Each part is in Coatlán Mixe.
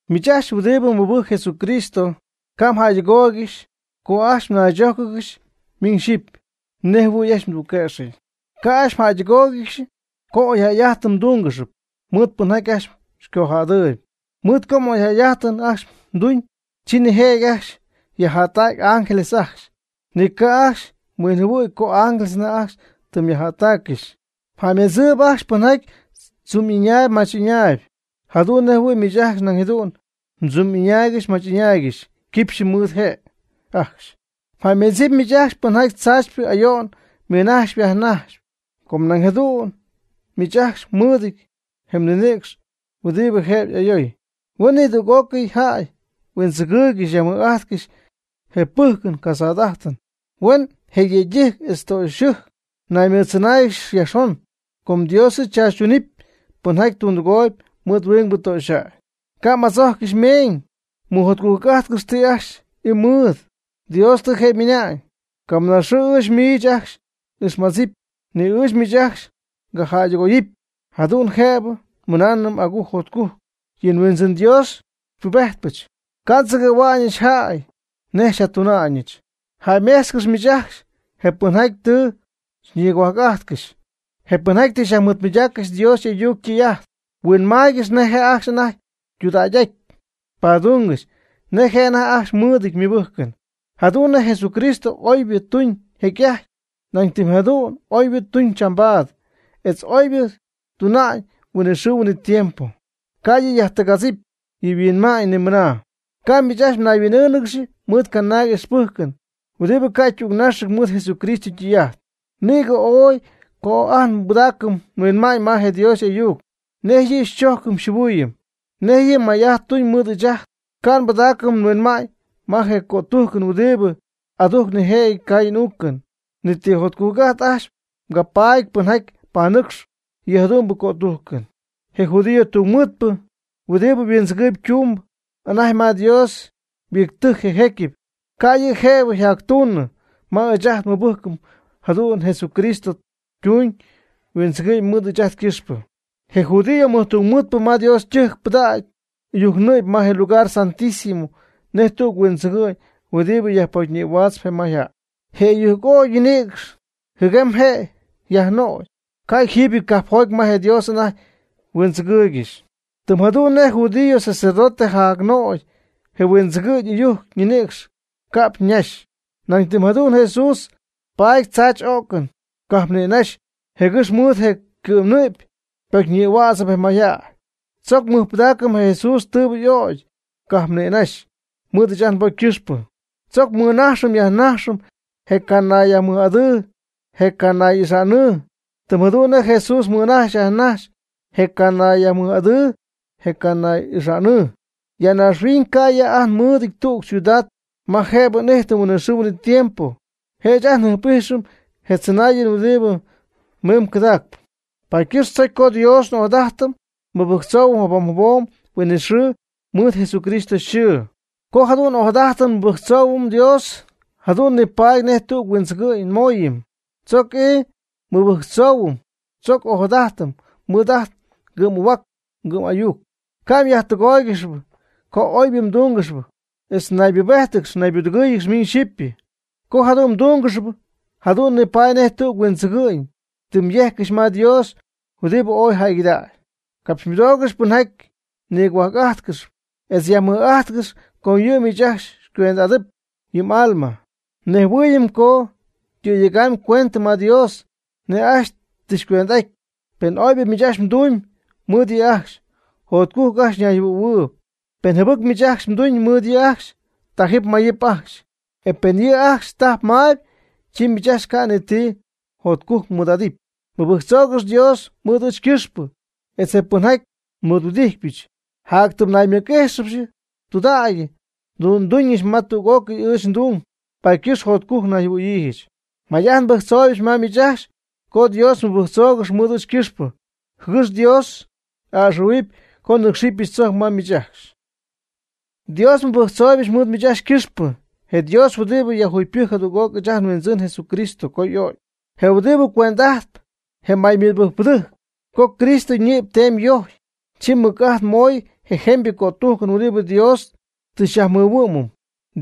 Miich ajcxy huɨdibɨ mɨbɨjcp Jesucristo, ca' mjäydɨgooygɨxy co ajcxy mnaychójcɨgɨxɨpy miñ xyipy nej jɨhuɨ̈y ajcxy mdügquëxyɨty. Ca' ajcxy mjäydɨgóoygɨxɨpy co oyjäy'ajtɨn mdúngɨxɨpy mɨɨd pɨnjaty ajcxy xycojädɨɨyb. Mɨɨd co oyjäy'ajtɨn ajcxy tuuñ, chi nijëjɨty ajcxy yajjättacy ángeles ajcxy, ni ca' ajcxy huinjɨhuɨy co ángeles anajty tɨ yajjättaaccɨxy. Mjäymedzɨp ajcxy pɨnjaty tzumy'ɨñaayb mach'ɨñaayb jadu'n nej jɨhuɨ̈y miich ajcxy nañ jadu'n mdzumy'ɨñaaygɨxy mmach'ɨñaaygɨxy quipxy mɨɨd je' ajcxy. Jäymeedzɨp miich ajcxy pɨnjaty tzaachypɨ ayo'n mɨnajxp yajnajxp, com nañ jadu'n miich ajcxy mɨɨdɨty je ninïcx huɨdibɨ jëbɨ y'ayoy. Huen nidüg'ócɨy jäy huindzɨgɨɨygɨxy yajmɨj'ajtcɨxy je pɨjcɨn casada'ajtɨn. Huen je yëydɨjc etz je ytöxyɨjc naymɨɨdtzɨnáayɨgɨxy yajxon, com Dios yɨ' tzaachytunɨpy pɨnjaty tundɨgooyb mɨɨd huingbɨ töxyjäy. Ca' m'adzojccɨxy meeñ. Mɨjotcujc'ájtcɨxy ti ajcxy ii mɨɨd. Dios tɨ je' ymɨna'ñ: “Camɨna xɨɨ ɨɨch miich ajcxy n'ixmadzɨpy, ni ɨɨch miich ajcxy ngajäydɨgoyɨpy.” Jadu'n jëbɨ nmɨnaanɨm agujc jotcujc: “Yɨ Huindzɨn Dios yɨ' xypubejtpɨch, ca' ndzɨgɨ̈hua'ñɨch jäy nej xyjatuna'ñɨch.” Jäymejtzcɨx miich ajcxy je pɨnjaty tɨ xyñigohuajc'ajtcɨxy, je pɨnjaty tɨ xyajmɨɨdmɨydaaccɨxy Dios y'ayuc ytɨy'ajt. Huinmaaygɨx nej je' ajcxy anajty ytudägy'aty, padungɨx nej je' anajty ajcxy mɨɨdɨty ymɨbɨjcɨn. Jadu'n nej Jesucristo oybɨ tuñ jecy'ajty, nañ tɨm jadu'n oybɨ tuñ chambaad, etz oybɨ tuna'ñ huinɨxɨɨ huinɨtiempo, ca' yɨ' yajtɨgadzip yɨ yhuinma'ñ ni mɨna. Ca' miich ajcxy myajhuin'ɨɨngɨxy mɨɨd canaag ixpɨjcɨn huɨdibɨ ca' ytügnaxɨty mɨɨd Jesucristo ytɨy'ajt. Nïgɨ oy co ajt nbɨdaacɨm nhuinma'ñ ma je Dios y'ayuc, nej yɨ' xychojcɨm xyjɨhuɨɨyɨm, nej yɨ' may'ajt tuñ mɨɨd ɨɨch ajt. Ca' mbɨdaacɨm mhuinma'ñ ma je cötujcɨn huɨdibɨ adujcp nijëjɨty caayɨn uucɨn. Ni ti jotcujc'ajt ajcxy capaty pɨnjaty panɨcxp yɨ jadu'mbɨ cötujcɨn. Je judío tungmɨɨdpɨ huɨdibɨ huindzɨgɨ'ñ tumb anajty ma Dios yhuittɨjc je jecyɨp, ca' yɨ' jëbɨ yjactuunɨ ma ɨɨch ajt nmɨbɨjcɨn jadu'n nej Jesucristo tuñ huindzɨgɨ'ñ mɨɨd ɨɨch ajt ycɨxpɨ. Je judío mɨjtungmɨɨdpɨ ma Dios ytɨjc ypɨdac ɨyujc ñɨ'py ma je Lugar Santísimo nej tüg huindzɨgɨ'ñ huɨdibɨ yajpocyñïhuaatzp je mayjäy. Je ɨyujc ögy ñinïcx jɨguem je' yajnögy, ca' jiibyɨty cajpjoty ma je Dios anajty huindzɨgɨɨygɨxy. Tɨm jadu'n nej je judío sacerdote yajnögy je huindzɨgɨ'ñ ɨyujc ñinïcx cajp nïnaxy, nañ tɨm jadu'n Jesús paty tzaachy'o'cɨn cajp nïnaxy jɨgɨx mɨɨd je' ycɨ'mnɨ'py pocyñïhuädzɨp je mayjäy. Tzoc mɨjpɨdaacɨm je Jesús tɨɨbɨ y'ögy cajp nïnaxy mɨɨd ɨɨch ajt nbocy ycɨxpɨ. Tzoc mɨnajxɨm yajnajxɨm je canayyajmɨj'adɨɨ je canay'ixa'nɨɨ, tɨm jadu'n nej Jesús mɨnajx yajnajx je canayyajmɨj'adɨɨ je canay'ixa'nɨɨ. Ya naaxhuiñ ca' ya ajt nmɨɨdɨty tüg ciudad ma jëbɨ n'ijtɨm huinɨxɨɨ huinɨtiempo, je' ɨɨch ajt njɨjp'ijxɨm je tzɨnaayɨn huɨdibɨ miimb cɨdaacp. Paady ycɨxp chojcpy co Dios n'ojadajtɨm nmɨbɨjctzoohuɨm jabom jabom huinɨxɨɨ mɨɨd Jesucristo yxɨɨ. Co jadu'n n'ojadajtɨm nmɨbɨjctzoohuɨm Dios jadu'n nipaady nej tüg huindzɨgɨ'ñ nmooyɨm. Tzoc ii mɨbɨjctzoohuɨm, tzoc ojadajtɨm mɨɨd ajt ngɨ'm'ahuac ngɨ'm'ayuc. Ca' mjäydɨgóoygɨxɨpy co oybɨ mdúngɨxɨpy etz naybubéjtɨgɨx naybudɨgɨ́ɨyɨgɨx miñ xyipy. Co jadu'n mdúngɨxɨpy jadu'n nipaady nej tüg huindzɨgɨ'ñ tɨ myejccɨxy ma Dios huɨdibɨ yɨ' ooy jäygɨdägy. Capxymɨdoogɨx pɨnjaty xyñigohuajc'ájtcɨxp etz yajmɨj'ajtcɨxp, com yɨ' miich ajcxy xycuend'ajtɨp yɨ m'alma. Nejhuɨɨyɨm co cɨ̈yegaangɨxy ycuendɨ ma Dios nej ajcxy tɨ xycuend'aty. Pen oybɨ miich ajcxy mdumyb mɨɨd yɨ' ajcxy, jotcujc ajcxy ñayjɨhuɨ̈huɨɨyb. Pen jɨbɨc miich ajcxy mduñ mɨɨd yɨ' ajcxy, tajɨp mayɨp ajcxy. E pen yɨ' ajcxy tajp maayb, chi miich ajcxy ca' ni ti jotcujc'ajt mmɨɨd'adɨpy. Mɨbɨjctzoogɨx Dios mɨɨd ɨɨch ycɨxpɨ etz je pɨnjaty xymɨɨdhuɨdijtpɨch. Jatytɨm naymɨc'íjxɨbɨch tudägy nduuñɨch ma tüg'ócɨy ɨɨch ndung, paady ycɨxp jotcujc nayjɨhuɨ̈yiijɨch. May'ajt nbɨjctzooybɨch ma miich ajcxy co Dios mmɨbɨjctzoogɨx mɨɨd ɨɨch ycɨxpɨ, jɨgɨx Dios a'ɨxɨ̈huɨpy co nɨ́cxɨbɨch tzojc ma miich ajcxy. Dios nmɨbɨjctzooybɨch mɨɨd miich ajcxy ycɨxpɨ. Je Dios huɨdibɨ yajjugypɨjc jadüg'oc ɨɨch ajt nHuindzɨn Jesucristo co y'o'cy, je huɨdibɨ cuend'ajtp je maymɨbɨjcpɨdɨjc. Co Jesucristo ñɨ'py teemy yojcy, chi mɨc'ajt moy je jemybɨ cötujcɨn huɨdibɨ Dios tɨ xyajmɨhuɨ'mɨm.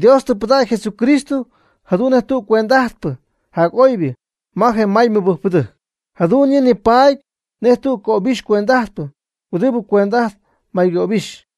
Dios tɨ pɨdägy Jesucristo jadu'n nej je cuend'ajtpɨ jac'oybɨ ma je maymɨbɨjcpɨdɨjc. Jadu'n yɨ' nipaady nej tüg cöbixy cuend'ajtpɨ huɨdibɨ cuend'ajtp may ngöbixy.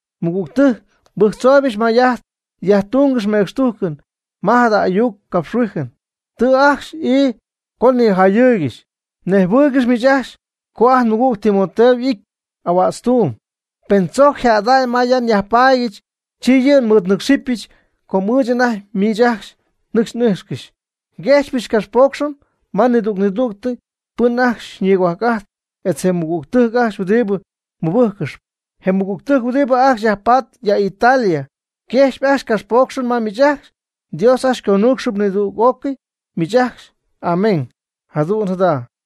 Nmɨgügtɨjc, nbɨjctzooybɨch may'ajt yajtungɨxy mecxtujcɨn ma jada ayuc capxhuijɨn. Tɨ ajcxy ii con nijayɨɨygɨxy. Nejhuɨɨygɨx miich ajcxy co ajt nmɨgüg Timoteo y'ity ahuätztuum. Pen tzojc yjädy ya ma nyajpaadyɨch, chi yɨ' xymɨɨdnɨ́cxɨbɨch co ɨɨch anajty miich ajcxy nɨcxy n'ijxcɨxy. Nguejxpyɨch ngapxpoocxɨn ma nidüg'ócɨy pɨn ajcxy xyñigohuajc'ajtp etz je mɨgügtɨjc ajcxy huɨdibɨ mɨbɨjccɨxyp. Je mɨgügtɨjc huɨdibɨ ajcxy yajpatp ya Italia yquejxyp ajcxy capxpoocxɨn ma miich ajcxy. Dios ajcxy xyconuucxɨp nidüg'ócɨy miich ajcxy. Amén. Jadu'n jada.